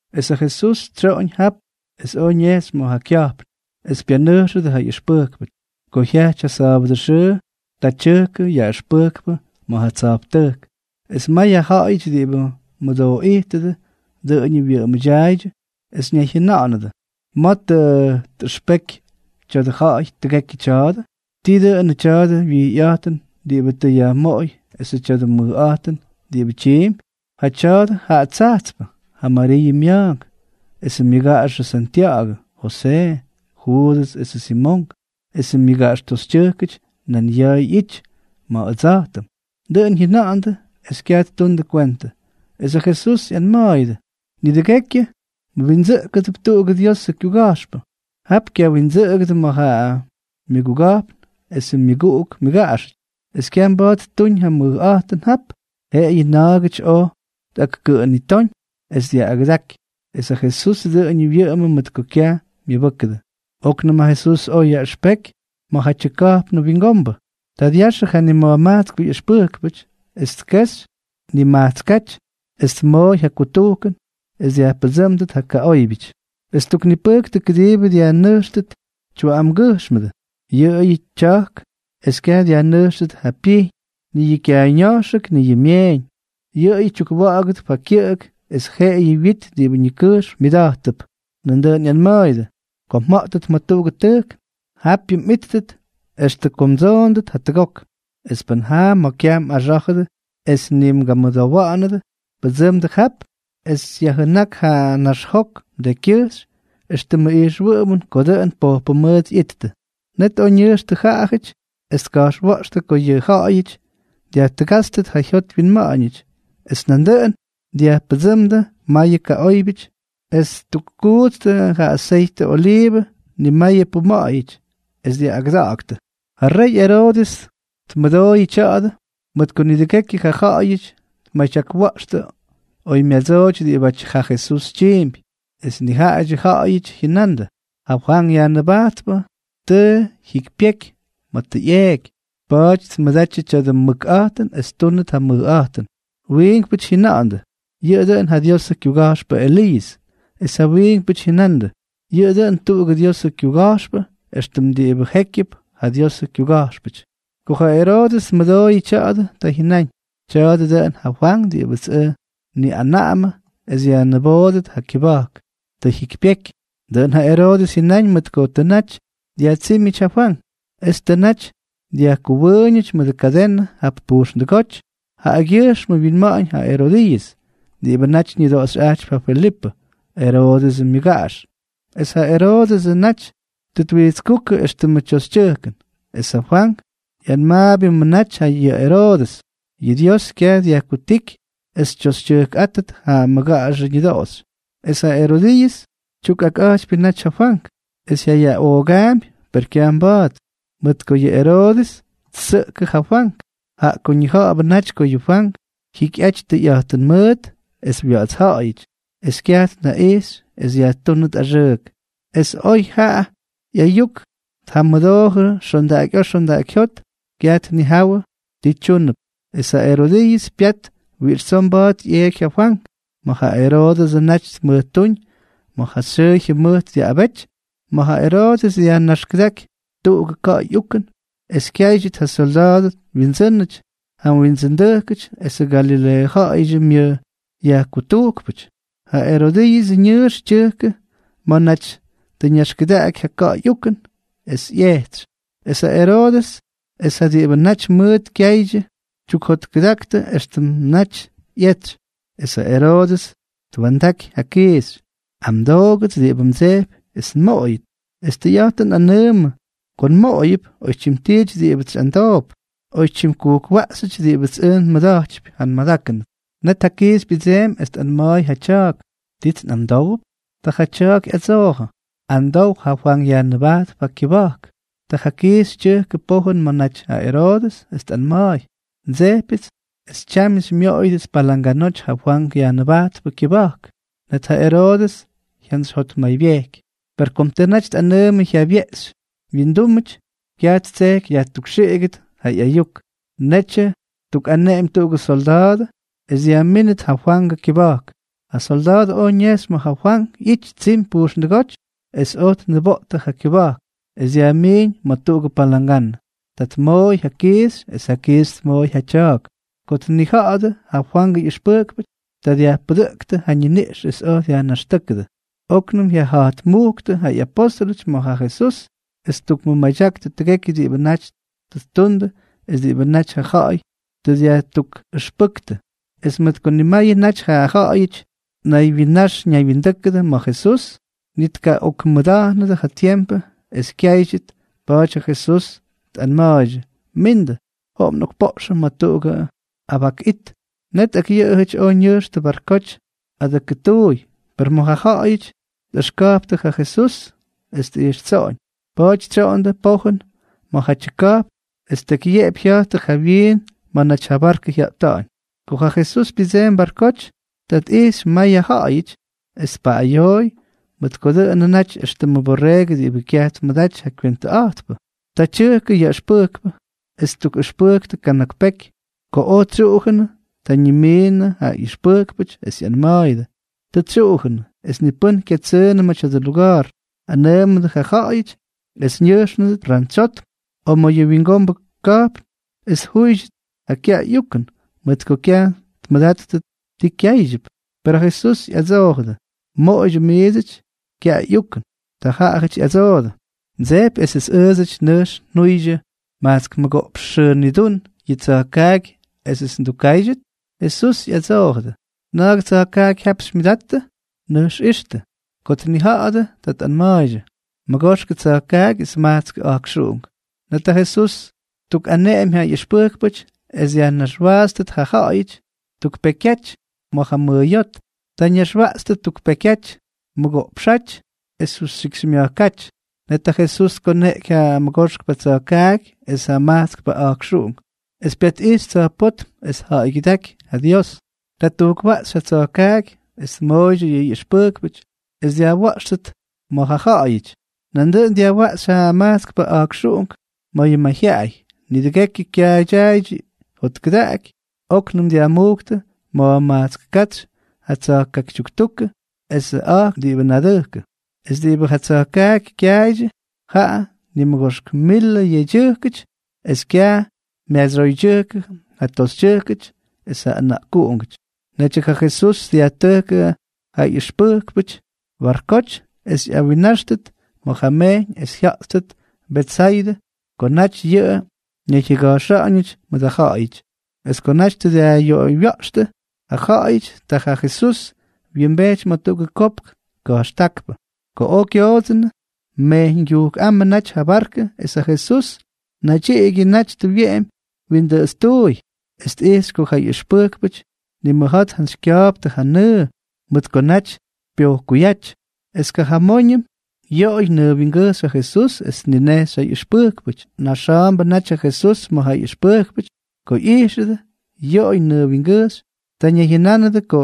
Es ja Jesús tsyoꞌoñ jap es oj ñejxy ma̱ ja kya̱jpn, es pyanʉjxʉdʉ ja ꞌyʉxpʉjkpʉty. Ko jyajty ja sa̱a̱bʉdʉ xʉʉ, ta tyʉjkʉ yaꞌʉxpʉjkpʉ ma̱ ja tsa̱jptʉjk, es may ja ja̱ꞌa̱yʉty diꞌibʉ mʉdooꞌijtʉdʉ dʉꞌʉñʉ wyʉꞌʉmʉdyaaydyʉ es ñayjyʉnánʉdʉ: —¿Ma̱ tʉ tꞌʉxpekyʉ tya̱dʉ ja̱ꞌa̱y tʉgekyʉ tya̱a̱dʉ? ¿Tii dʉnʉ tya̱dʉ wijyꞌa̱jtʉn diꞌibʉ tʉ yajmoꞌoy esʉ tya̱dʉ mʉjꞌa̱jtʉn diꞌibʉ tyiimpy? Jaꞌa tya̱a̱dʉ ja tsajtspʉ, ja Mariiʉ mya̱a̱nk esʉ myʉgaꞌaxʉ Santya̱ꞌa̱gʉ, Josee, Juudʉs esʉ Simonk, esʉ myʉgaꞌax toxytyʉjkʉty nan ya̱a̱ ꞌyity ma̱ ʉdsa̱jtʉm. Dʉꞌʉn jyʉna̱ꞌa̱ndʉ es kyaj ttundʉ kwentʉ. Es ja Jesús ꞌyanma̱a̱yʉdʉ: —Nidʉgekyʉ wyindsʉꞌkʉdʉp tuꞌugʉ Diosʉ kyuga̱jxpʉ. Jap kyawindsʉꞌʉgʉdʉ ma̱ ja myʉguga̱jpn esʉ myʉguꞌuk myʉgaꞌaxʉty. Es kyaj mba̱a̱t ttuuñ ja mʉjꞌa̱jtʉn jap, jeꞌeyʉ na̱a̱gʉty oj tꞌakkʉꞌʉnitóñ es dyaꞌꞌagʉdaky. Es ja Jesús dʉꞌʉñʉ wyʉꞌʉmʉ mʉt ko kyaj myʉbʉ́kʉdʉ. Oknʉm ja Jesús oj yaꞌʉxpeky ma̱jatyʉ ka̱jpnʉ wingombʉ. Ta dyaxʉ ja nima̱jmajtskpʉ ꞌyʉxpʉjkpʉty, es tkejxy nimajtskáty, es tmooy ja kutujkʉn es dyajpʉdsʉ́mdʉt ja kaꞌóybyʉty. Es ttuknipʉjktʉ kʉdiibʉ dyajnʉjxtʉt tyuꞌamgyʉjxmʉdʉ, yʉꞌʉyʉ tya̱jk, es kyaj dyajnʉjxtʉt ja pyijñ, ni yʉ kyaayña̱jxʉk, ni yʉ myeeñ, yʉꞌʉyʉ tyukwa̱ꞌa̱gʉdʉp ja kyʉꞌʉk es jeꞌeyʉ wit diꞌibʉ ñikʉjxm myʉda̱jttʉp. Nandʉꞌʉn ꞌyanma̱a̱yʉdʉ: —Ko mja̱ꞌtʉt ma̱ tuꞌugʉ tʉjk, japyʉ mꞌíttʉt extʉ ko mdsoondʉt jatʉgok. Es pʉn jaa ma̱ kyaj mꞌaxá̱jʉdʉ es ni mgamʉdowa̱ꞌa̱nʉdʉ, pʉdsʉmdʉ jap es yajjʉnák ja naxjok mdekykyʉjxy éxtʉmʉ ijxwʉꞌʉmʉn ko dʉꞌʉn pojpʉ mʉʉt ꞌyittʉ. Net oj ñʉjxtʉ jaꞌajʉty es tka̱jxwa̱ꞌxtʉ ko yʉ ja̱ꞌa̱yʉty dyajtʉgátstʉt ja jyot wyinma̱ꞌa̱ñʉty. Es nandʉꞌʉn dyajpʉdsʉʉmdʉ mayʉ kaꞌóybyʉty es ttukkuꞌtstʉ ja aseytʉ oliivʉ nimayʉ puma̱ꞌa̱yʉty, es dyaꞌꞌagʉdaktʉ. Ja rey Eroodʉs tmʉdooyʉ tya̱a̱dʉ, mʉt ko nidʉgekyʉ ja ja̱ꞌa̱yʉty tmadyakwa̱ꞌxtʉ oymyadsooty diꞌibátyʉ ja Jesús tyiimpy. Es nijaꞌadyʉ ja̱ꞌa̱yʉty jyʉnandʉ: —Ja Fwank Yajnʉbajtpʉ tʉ jyikypyeky ma̱ tʉ ꞌyeeky, pa̱a̱ty tmʉdatyʉ tya̱dʉ mʉkꞌa̱jtʉn es ttúnʉt ja mʉjꞌa̱jtʉn. Wiinkpʉty jyʉna̱ꞌa̱ndʉ: —Yʉꞌʉ dʉꞌʉn ja Diosʉ kyuga̱jxpʉ Eliiʉs. Es ja wiinkpʉty jyʉnandʉ: —Yʉꞌʉ dʉꞌʉn tuꞌugʉ Diosʉ kyuga̱jxpʉ, éxtʉm diꞌibʉ jékyʉp ja Diosʉ kyuga̱jxpʉty. Ko ja Eroodʉs tmʉdooyʉ tya̱a̱dʉ, ta jyʉnáñ: —Tya̱a̱dʉ dʉꞌʉn ja Fwank diꞌibʉts ʉj nniꞌanaꞌamʉ es yajniboodʉt ja kyʉba̱jk. Tʉ jyikypyeky. Dʉꞌʉn ja Eroodʉs jyʉnáñ mʉt ko tʉ naty dyajtsímyʉty ja Fwank, es tʉ naty dyajkʉwʉʉñʉty mʉdʉ kadenʉ jap pujxndʉgóty jaꞌagyʉjxmʉ wyinma̱ꞌa̱ñ ja Erodiiʉs, diꞌibʉ naty ñʉdoꞌoxyꞌajtypy ja Felipʉ, Eroodʉsʉ myʉgaꞌax, es ja Eroodʉsʉ naty tʉ twijtskúkʉ éxtʉmʉ tyoxytyʉjkʉn. Es ja Fwank ꞌyanmaabyʉmʉ naty yʉ Eroodʉs: —Yʉ Dios kyaj dyajkutíky es xytyoxytyʉjkꞌátʉt ja mmʉgaꞌaxʉ ñʉdoꞌoxy. Es ja Erodiiʉs tyukꞌakꞌa̱jtypyʉ naty ja Fwank, es jyayaꞌoogaampy, per kyaj mba̱a̱t, mʉt ko yʉ Eroodʉs ttsʉꞌkʉ ja Fwank, jaꞌa ko ñija̱ꞌa̱bʉ naty ko yʉ Fwank jyikyꞌaty tʉyꞌa̱jtʉn mʉʉt es wya̱ꞌa̱tsja̱ꞌa̱yʉty, es kyaj tnaꞌijxy es yajtúnʉt axʉʉk. Es oy ja ꞌya̱a̱ ꞌyayuk tjamʉdoojʉ xondaꞌakyꞌa̱a̱ xondaꞌakyjyót, kyaj tnijawʉ ti tyúnʉp. Es ja Erodiiʉs pyat wiꞌix tsoo mba̱a̱t ꞌyeeky ja Fwank ma̱ ja Eroodʉsʉ naty tmʉjtúñ ma̱ ja xyʉʉ jyʉmʉjt dyaꞌꞌabety, ma̱ Eroodʉs dyajnaxkʉdáky tuꞌugʉ ka̱ꞌa̱y ukʉn es kyáydyʉt ja syolda̱a̱dʉ wyindsʉ́nʉty, ja windsʉndʉjkʉty esʉ Galileeʉ ja̱ꞌa̱yʉdyʉ myʉj yajkutujkpʉty. Ja Erodiiʉsʉ ñʉʉx tyʉjkʉ ma̱ naty tʉ ñaxkʉdaꞌaky ja ka̱ꞌa̱y ukʉn es ꞌyejtsy, es ja Eroodʉs es ja diꞌibʉ naty mʉʉt kyaaydyʉ tyukjotkʉdaktʉ éxtʉmʉ naty ꞌyetsy. Es ja Eroodʉs twa̱ndaky ja kiixy: —Amdoogʉts diꞌibʉ mdsejpy es nmoꞌoyʉt, es tʉyꞌa̱jtʉn nꞌanʉʉmʉ ko nmoꞌoyʉp oytyim tiity diꞌibʉts xyꞌamdoop, oytyim kujkwaꞌxyʉty diꞌibʉts ʉj nmʉda̱jtypy. Net ja kiixy pyʉdseemy, es tꞌanma̱a̱y ja tya̱a̱k: —¿Tits nꞌamdówʉp? Ta ja tya̱a̱k ꞌyadsoojʉ: —Amdow ja Fwank Yajnʉbajtpʉ kyʉba̱jk. Ta ja kiixy tyʉjkʉ pojʉn ma̱ naty ja Eroodʉs, es tꞌanma̱a̱y: —Ndsejpyʉts es tyamyʉ xymyoꞌoyʉdʉts palanganoty ja Fwank Yajnʉbajtpʉ kyʉba̱jk. Net ja Eroodʉs jyantsyjyotmaybyejky. Per kom tʉ naty tꞌanʉʉmʉ jyabyeꞌxy wyindúmʉty, kyaj ttseky yajtukxiꞌigʉt ja ꞌyayuk. Netyʉ ttukꞌaneꞌemy tuꞌugʉ syolda̱a̱dʉ es dyajmínʉt ja Fwangʉ kyʉba̱jk. Ja solda̱a̱dʉ oj ñejxy ma̱ ja Fwank ꞌyity tsimy pujxndʉgóty es oj tniboꞌtʉ ja kyʉba̱jk es dyajmiiñ ma̱ tuꞌugʉ palanganʉ. Ta tmooy ja kiixy es ja kiixy tmooy ja tya̱a̱k. Ko tnija̱ꞌa̱dʉ ja Fwangʉ ꞌyʉxpʉjkpʉty, ta dyajpʉdʉꞌktʉ ja ñiniꞌx es oj dyajnaxtʉ́kʉdʉ. Oknʉm ꞌyaja̱jtmujktʉ ja apóstʉlʉty ma̱ ja Jesús, es ttukmʉmadyaktʉ tʉgekyʉ diꞌibʉ naty tʉ ttundʉ es diꞌibʉ naty ja ja̱ꞌa̱y tʉ dyajtukꞌʉxpʉ́ktʉ. Es mʉt ko nimayʉ naty ja ja̱ꞌa̱yʉty ñaywyinax ñaywyindʉ́kʉdʉ ma̱ Jesús, ni tkaꞌokmʉda̱jnʉdʉ ja tiempʉ es kyáydyʉt, pa̱a̱ty ja Jesús tꞌanma̱a̱ydyʉ: —Mindʉ. Joꞌom nꞌokpoꞌxʉm ma̱ tuꞌugʉ abak it. Net ak yʉꞌʉjʉty oj ñʉjxtʉ barkoty adʉkʉtuuy. Per may ja ja̱ꞌa̱yʉty tꞌʉxka̱jptʉ ja Jesús es tꞌijxtsoꞌoñ. Pa̱a̱ty tsyoꞌondʉ pojʉn ma̱jatyʉ ka̱jpn, es tekyyeꞌepy jya̱jttʉ jawyiin ma̱ naty ja barkʉ jyata̱ꞌa̱ñ. Ko ja Jesús pyʉdseemy barkoty, ta tꞌijxy may ja ja̱ꞌa̱yʉty es tpaꞌꞌayooy, mʉt ko dʉꞌʉnʉ naty éxtʉmʉ borreegʉ diꞌibʉ kyaj tmʉdaty ja kywentʉꞌa̱jtpʉ. Ta tyʉjkʉ yaꞌʉxpʉjkpʉ, es ttukꞌʉxpʉjktʉ kana̱k peky. Ko oj tsyuꞌujʉnʉ, ta ñimiinʉdʉ ja ꞌyʉxpʉjkpʉty es ꞌyanma̱a̱yʉdʉ: —Tʉ tsyuꞌujʉnʉ, es ni pʉ́n kyatsʉʉnʉ ma̱ tya̱dʉ luga̱a̱r. Anʉʉmʉdʉ ja ja̱ꞌa̱yʉty es ñʉjxnʉdʉt rantsyotm o ma̱ yʉ wingombʉ ka̱jpn es tjúydyʉt ja kyaꞌay ꞌyukʉn, mʉt ko kyaj tmʉdattʉ ti kyáydyʉp. Per ja Jesús ꞌyadsoojʉdʉ: —Moꞌoydyʉ miidsʉty kyaꞌay ꞌyukʉn. Ta jaꞌajʉty ꞌyadsoodʉ: —¿Mdsejpy esʉts ʉʉdsʉty nʉjx njuydyʉ majtsk mʉgoꞌpx xʉʉ nidún yʉ tsa̱jkaaky esʉts ndukkáydyʉt? Jesús ꞌyadsoojʉdʉ: —¿Na̱a̱gʉ tsa̱jkaaky jap xymyʉdattʉ? Nʉjx ixtʉ. Ko tnija̱ꞌa̱dʉ, ta tꞌanma̱a̱ydyʉ: —Mʉgoxkʉ tsa̱jkaaky es majtskʉ a̱jkxuꞌunk. Net ja Jesús ttukꞌaneꞌemy ja ꞌyʉxpʉjkpʉty es dyajnaxwaatstʉt ja ja̱ꞌa̱yʉty tuk pekyaty ma̱ ja mʉʉyóty. Ta ñaxwaꞌtstʉ tuk pekyaty mʉgoꞌpxáty es justyikxymya̱jkáty. Net ja Jesús tkoneꞌky ja mʉgoxkpʉ tsa̱jkaaky es ja majtskpʉ a̱jkxuꞌunk, es pyatꞌijxy tsa̱jpótm es tja̱ꞌa̱ygyʉdáky ja Dios. Ta ttujkwaꞌxy ja tsa̱jkaaky es tmooydyʉ ja ꞌyʉxpʉjkpʉty es dyajwa̱ꞌxtʉt ma̱ ja ja̱ꞌa̱yʉty. Nandʉꞌʉn dyajwaꞌxy ja majtskpʉ a̱jkxuꞌunk ma̱ ja mayjyaꞌay. Nidʉgekyʉ kyaaydyaaydyʉ jotkʉdaꞌaky. Oknʉm dyajmujktʉ ma̱jmajtsk katsy ja tsa̱jkaaky tyuktukʉ esʉ a̱jkx diꞌibʉ nadʉjkʉ. Es diꞌibʉ ja tsa̱jkaaky kyaaydyʉ, jaꞌa nimʉgoxk milʉ yedyʉjkʉty, es kyaj myadsyoydyʉjkʉ ja toxytyʉjkʉty es ja ʉna̱ꞌkuꞌungʉty. Netyʉ ja Jesús dyajtʉjkʉ ja ꞌyʉxpʉjkpʉty barkoty es ꞌyawinnáxtʉt ma̱ ja mejyñ es jya̱ꞌttʉt Betsaydʉ ko naty yʉꞌʉ ñayjyʉgajxyʉty mʉt ja ja̱ꞌa̱yʉty. Es ko naty tʉ dyajꞌyoꞌoywya̱ꞌxtʉ ja ja̱ꞌa̱yʉty, ta ja Jesús wyimbejty ma̱ tuꞌugʉ kopk ka̱jxtákpʉ. Ko oj kyoodsʉnʉ, mejyñgyujkꞌámʉ natyñʉ ja barkʉ es ja Jesús naydyiꞌigyʉ naty tʉ wyeꞌemy windʉꞌʉtstuuy, es tꞌijxy ko ja ꞌyʉxpʉjkpʉty nimʉja̱a̱ tjantsykya̱a̱ptʉ ja nʉʉ, mʉt ko naty pyojkuyáty. Es kajamóñʉm yoꞌoy nʉʉ wingʉjxy ja Jesús es tninejxy ja ꞌyʉxpʉjkpʉty. Na̱jxa̱a̱mbʉ naty ja Jesús ma̱ ja ꞌyʉxpʉjkpʉty ko ꞌyijxʉdʉ yoꞌoy nʉʉ wingʉjxy. Ta ñayjyʉnánʉdʉ ko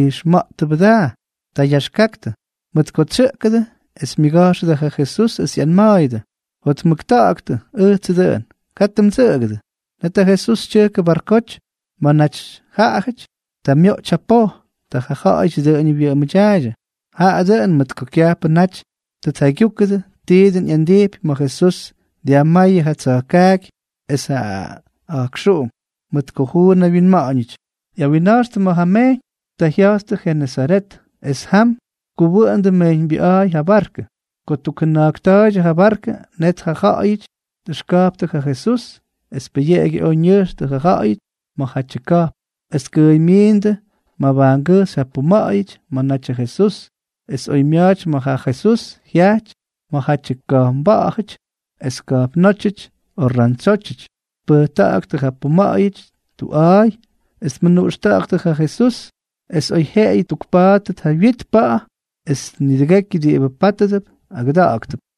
ijxma̱ꞌttʉbʉ daa. Ta yaxkaktʉ, mʉt ko tsyʉꞌkʉdʉ. Es myʉga̱jxʉdʉ ja Jesús, es ꞌyanma̱a̱yʉdʉ: —¡Jotmʉkta̱ꞌa̱ktʉ! Ʉjtsʉ dʉꞌʉn. Katʉ mdsʉꞌʉgʉdʉ. Net ja Jesús tyʉjkʉ barkoty ma̱ naty jaꞌajʉty. Ta myoꞌty ja poj. Ta jaꞌajʉty dʉꞌʉñʉ wyʉꞌʉmʉdyaaydyʉ, jaꞌa dʉꞌʉn mʉt ko kyajpʉ naty tʉ tjaygyúkʉdʉ ti dʉn ꞌyandijpy ma̱ Jesús dyajmáyʉ ja tsa̱jkaaky es ja a̱jkxuꞌunk, mʉt ko juun wyinma̱ꞌa̱ñʉty. ꞌYawinna̱jxtʉ ma̱ ja mejyñ. Ta jya̱jttʉ Jenesaret, es jam tkuwʉꞌʉndʉ mejyñbyʉꞌa̱a̱y ja barkʉ. Ko ttukjʉna̱jkta̱a̱ydyʉ ja barkʉ, net ja ja̱ꞌa̱yʉty tꞌʉxka̱jptʉ ja Jesús es pʉyeꞌegyʉ oj ñʉjxtʉ ja ja̱ꞌa̱yʉty ma̱jatyʉ ka̱jpn, es tkʉʉymyiindʉ mabajngʉjxy ja puma̱ꞌa̱yʉty ma̱ natyʉ Jesús. Es oymya̱a̱ty ma̱ ja Jesús jyaꞌty ma̱jatyʉ ka̱jpnba̱ꞌa̱jʉty es ka̱jpnótyʉty o rantsyótyʉty, tpʉjta̱ꞌa̱ktʉ ja puma̱ꞌa̱yʉty tuꞌa̱a̱y es tmʉnuꞌxta̱ꞌa̱ktʉ ja Jesús es oyjyeꞌeyʉ tpa̱a̱ttʉt ja wyit pa̱ꞌa̱. Es nidʉgekyʉ diꞌibʉ pátʉdʉp agʉdáktʉp.